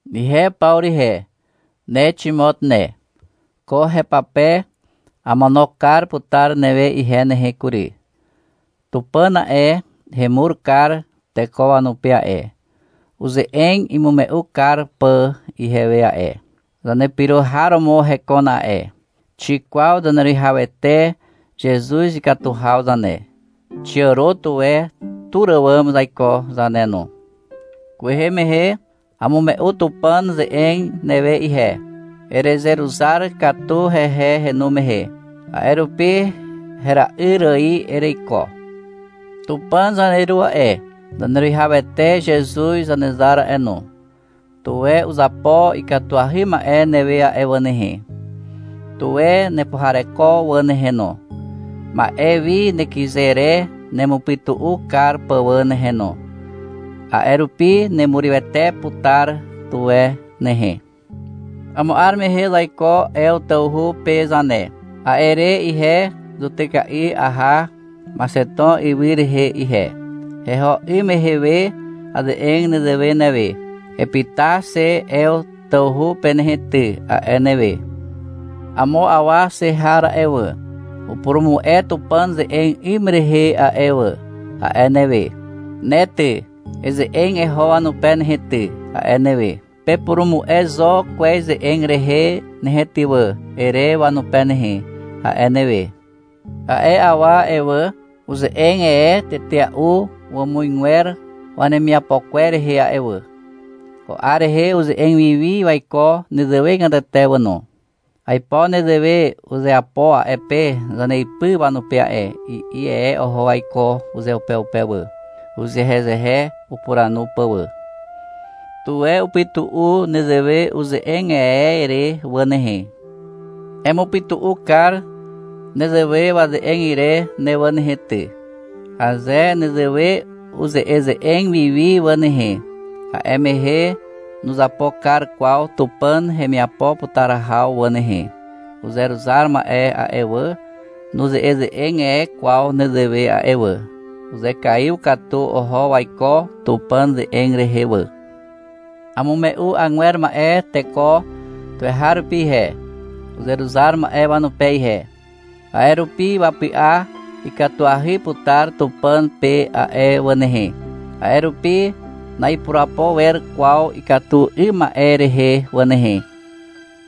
Ihe Pawru ihe, ne Ximot ne. Ko hepape amono kar putar newe ihe nehe kury. Tupàn a'e, hemur kar teko wanupe a'e, uze'eg imume'u kar pà ihewe a'e. Zanepyro har romo hekon a'e. Xikwaw Zaneruwihawete Zezuz ikatu haw zane. Xiàro tuwe tur àwàm zaiko zane no. Kwehe mehe amume'u Tupàn ze'eg newe ihe. Erezeruzar katu hehe henu mehe. A'e rupi hera'yr ài ereiko. Tupàn zaneru a'e, Zaneruwihawete Zezuz Zanezar a'e no, tuwe uzapo ikatuahy ma'e newe a'e wà nehe. Tuwe nepuhareko wà nehe no, ma'e wi nekyze re nemupytu'u kar pà wà nehe no, a'e rupi nerurywete putar tuwe nehe. Amo 'ar mehe zaiko Ew tawhu pe zane. A'e re ihe zutyka'i aha Maxeton ywy rehe ihe. Heho 'ym mehe we aze'eg nezewe newe. — Epyta xe Ew tawhu pe nehe ty, a'e newe. — Amo awa xe har a'e wà, upurumu'e Tupàn ze'eg 'ym rehe a'e wà, a'e newe. — Ne ty, eze'eg eho wanupe nehe ty, a'e newe. — Pepurumu'e zo kwez ze'eg rehe nehe ty wà, ere wanupe nehe, a'e newe. A'e awa a'e wà, uze'eg e tetea'u wàmuzgwer wanemiapo kwer rehe a'e wà. Ko 'ar rehe uze'eg wiwi waiko nezewegatete wà no. — Aipo nezewe uzeapo a'e pe zaneipy wanupe a'e, i'i e oho waiko uzeupeupe wà, uzehezehe upuranu pà wà. Tuwe upytu'u nezewe uze'eg e re wà nehe. Emupytu'u kar nezewe waze'eg ire ne wà nehe ty. Aze nezewe uze'eze'eg wiwi wà nehe, a'e mehe nuzapo kar kwaw Tupàn hemiapo putar haw wà nehe. Uzeruzar ma'e a'e wà, nuze'eze'eg e kwaw nezewe a'e wà. Uzekaiw katu oho waiko Tupàn ze'eg rehe wà. Amume'u agwer ma'e teko tuweharupi ihe, uzeruzar ma'e wanupe ihe. A'e rupi wapy'a ikatuahy putar Tupàn pe a'e wà nehe. A'e rupi na'ipurapo wer kwaw ikatu 'ym ma'e rehe wà nehe.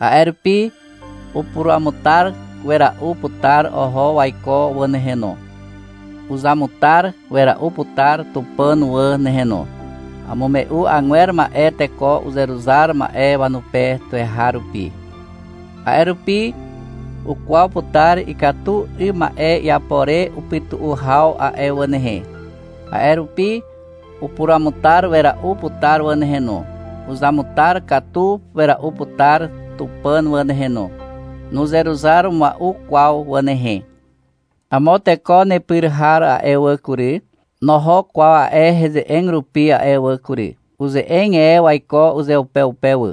A'e rupi upuruamutar wera'u putar oho waiko wà nehe no. Uzamutar wera'u putar Tupàn wà nehe no. Amume'u agwer ma'e teko uzeruzar ma'e wanupe tuweharupi. A'e rupi ukwaw putar ikatu 'ym ma'e iapo re upytu'u haw a'e wà nehe. A'e rupi upuruamutar wera'u putar wà nehe no. Uzamutar katu wera'u putar Tupàn wà nehe no. Nuzeruzar mua'u kwaw wà nehe. Amo teko nepyr har a'e wà kury, noho kwaw a'e heze'eg rupi a'e wà kury. Uze'eg e waiko uzeupeupe wà.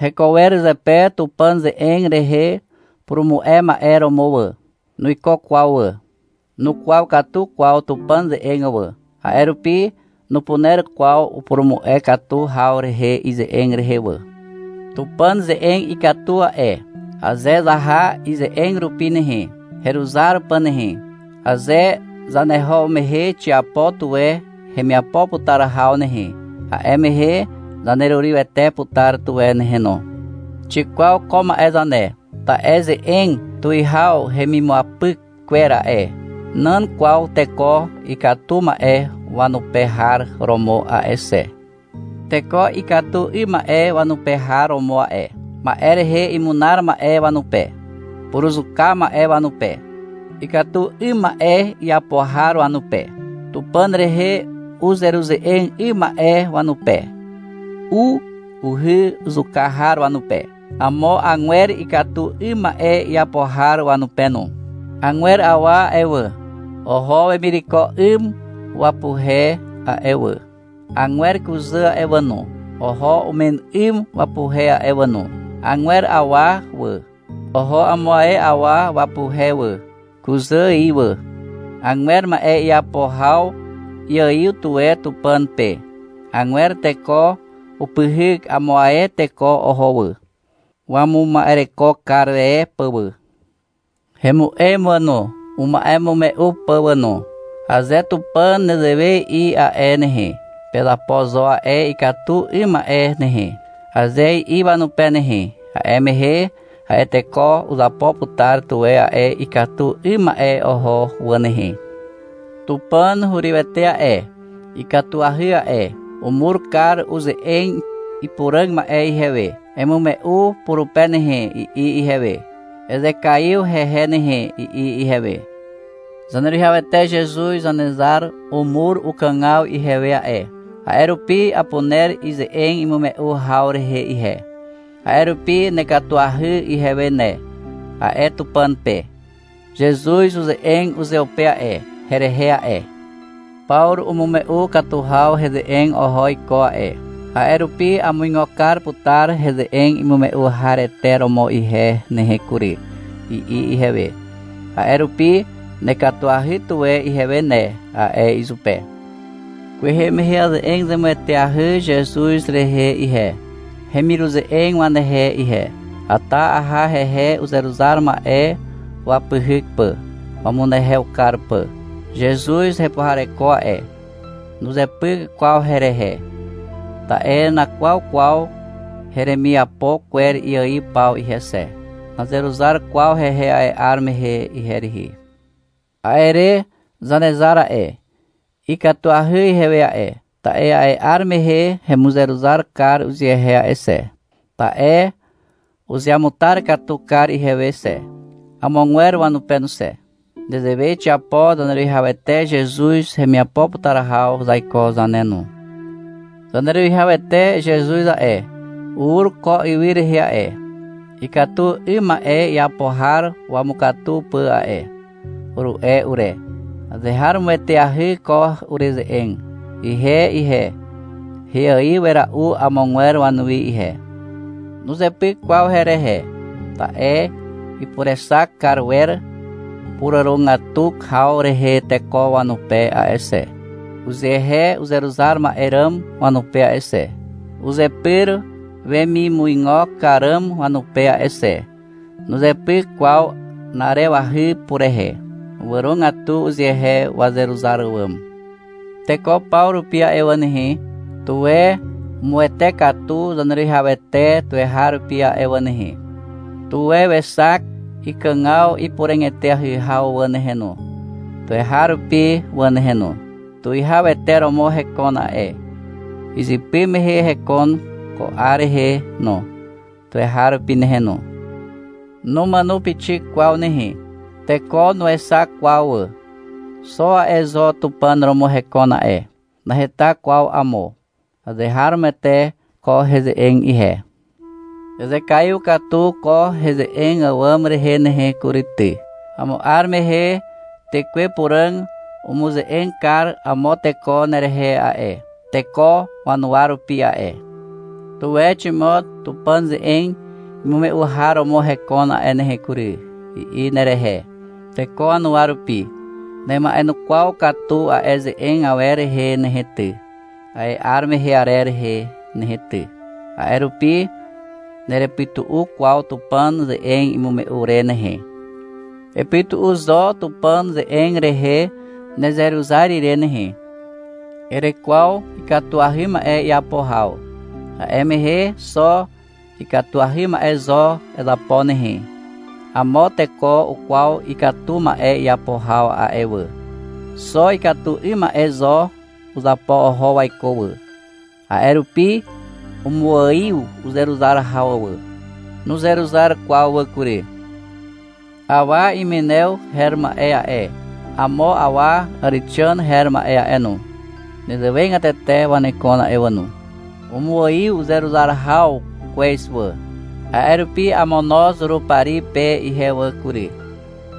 Heko wer zepe Tupàn ze'eg rehe purumu'e ma'e romo wà. Nuiko kwaw wà. Nukwaw katu kwaw Tupàn ze'eg wà, a'e rupi nupuner kwaw upurumu'e katu haw rehe ize'eg rehe wà. Tupàn ze'eg ikatu a'e. Aze zaha ize'eg rupi nehe, heruzar pà nehe, aze zaneho mehe xiapo tuwe hemiapo putar haw nehe, a'e mehe zanerurywete putar tuwe nehe no. Xikwaw ko ma'e zane. Ta'e ze'eg tuwihaw hemimuapyk kwer a'e, nan kwaw teko ikatu ma'e wanupe har romo a'e xe. Teko ikatu 'ym ma'e wanupe har romo a'e, ma'e rehe imunar ma'e wanupe, puruzuka ma'e wanupe, ikatu 'ym ma'e iapo har wanupe, Tupàn rehe uzeruze'eg 'ym ma'e wanupe, u, uhy zuka har wanupe, amo agwer ikatu 'ym ma'e iapo har wanupe no. Agwer awa a'e wà, oho wemireko 'ym wapuhe a'e wà. Agwer kuzà a'e wà no, oho umen 'ym wapuhe a'e wà no. Agwer awa wà, oho amo ae awa wapuhe wà, kuzà ài wà. Agwer ma'e iapo haw iaiw tuwe Tupàn pe. Agwer teko upyhyk amo ae teko oho wà, wamuma'ereko kar e pà wà. Hemu'em wà no, uma'emume'u pà wà no. Aze Tupàn nezewe i'i a'e nehe, — Pezapo zo a'e ikatu 'ym ma'e nehe, aze i'i wanupe nehe, a'e mehe a'e teko uzapo putar tuwe a'e ikatu 'ym ma'e oho wà nehe. Tupàn hurywete a'e, ikatuahy a'e. Umur kar uze'eg ipuràg ma'e ihewe. Emume'u purupe nehe, i'i ihewe. Ezekaiw hehe nehe, i'i ihewe. Zaneruwihawete Zezuz Zanezar umur ukàgaw ihewe a'e, a'e rupi apuner ize'eg imume'u haw rehe ihe. A'e rupi — Nekatuahy ihewe ne, a'e Tupàn pe. Zezuz uze'eg uzeupe a'e, herehe a'e. — Pawru umume'u katu heze'eg oho iko a'e, a'e rupi amuigo kar putar heze'eg imume'u harete romo ihe nehe kury, i'i ihewe. A'e rupi — Nekatuahy tuwe ihewe ne, a'e izupe. Kwehe mehe aze'eg zemueteahy Zezuz rehe ihe, hemiruze'eg wanehe ihe. Ata aha hehe uzeruzar ma'e wapyhyk pà, wamunehew kar pà. Zezuz hepuhareko a'e. Nuzepyk kwaw herehe. Ta'e nakwaw kwaw heremiapo kwer iaiw paw ihe xe. Nazeruzar kwaw hehe a'e 'ar mehe ihe rihi. A'e re Zanezar a'e, ikatuahy ihewe a'e, ta'e a'e 'ar mehe hemuzeruzar kar uzehe a'e xe. Ta'e uzeamutar katu kar ihewe xe, amogwer wanupe no xe. Nezewe xiapo Zaneruwihawete Zezuz hemiapo putar haw zaiko zane no. — Zaneruwihawete Zezuz a'e, ur ko ywy rehe a'e, ikatu 'ym ma'e iapo har wamukatu pà a'e, uru'e ure. Azeharomoeteahy ko ureze'eg. Ihe ihe, heaiw wera'u amogwer wanuwi ihe. Nuzepyk kwaw herehe. Ta'e ipurexak kar wer puràrogatu haw rehe teko wanupe a'e xe, uzehe uzeruzar ma'e ràm wanupe a'e xe, uzepyr wemimuigo kar ràm wanupe a'e xe. Nuzepyk kwaw na'arewahy purehe. Wàrogatu uzehe wazeruzar àwàm. Teko paw rupi a'e wà nehe, tuwe umuwete katu Zaneruwihawete tuweharupi a'e wà nehe. Tuwe wexak ikàgaw ipuràg eteahy haw wà nehe no, tuweharupi wà nehe no. Tuwihawete romo hekon a'e. Izypy mehe hekon, ko 'ar rehe no, tuweharupi nehe no. Numàno pixik kwaw nehe. Teko nuexak kwaw wà. Xo a'e zo Tupàn romo hekon a'e. Naheta kwaw amo. Azeharomoete ko heze'eg ihe. Ezekaiw katu ko heze'eg àwàm rehe nehe kury ty. Amo 'ar mehe Tekwe Puràg umuze'eg kar amo teko nerehe a'e, teko wanuwa rupi a'e. — Tuwe Ximot Tupàn ze'eg imume'u har romo hekon a'e nehe kury, i'i nerehe, teko wanuwa rupi. Nema'enukwaw katu a'e ze'eg awer rehe nehe ty, a'e 'ar mehe arer rehe nehe ty. A'e rupi nerepytu'u kwaw Tupàn ze'eg imume'u re nehe. Epytu'u zo Tupàn ze'eg rehe nezeruzar ire nehe. Erekwaw ikatuahy ma'e iapo haw. A'e mehe xo ikatuahy ma'e zo ezapo nehe. Amo teko ukwaw ikatu ma'e iapo haw a'e wà. Xo ikatu 'ym ma'e zo uzapo oho waiko wà. A'e rupi umuaiw uzeruzar haw wà. Nuzeruzar kwaw wà kury. Awa Imenew her ma'e a'e, amo awa Àrexàn her ma'e a'e no, nezewegatete wanekon a'e wà no. Umuaiw uzeruzar haw kwez wà. A'e rupi amono Zurupari pe ihe wà kury.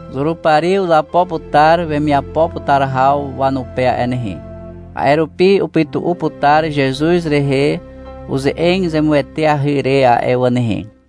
Zurupari uzapo putar wemiapo putar haw wanupe a'e nehe. A'e rupi upytu'u putar Zezuz rehe uze'eg zemueteahy re a'e wà nehe.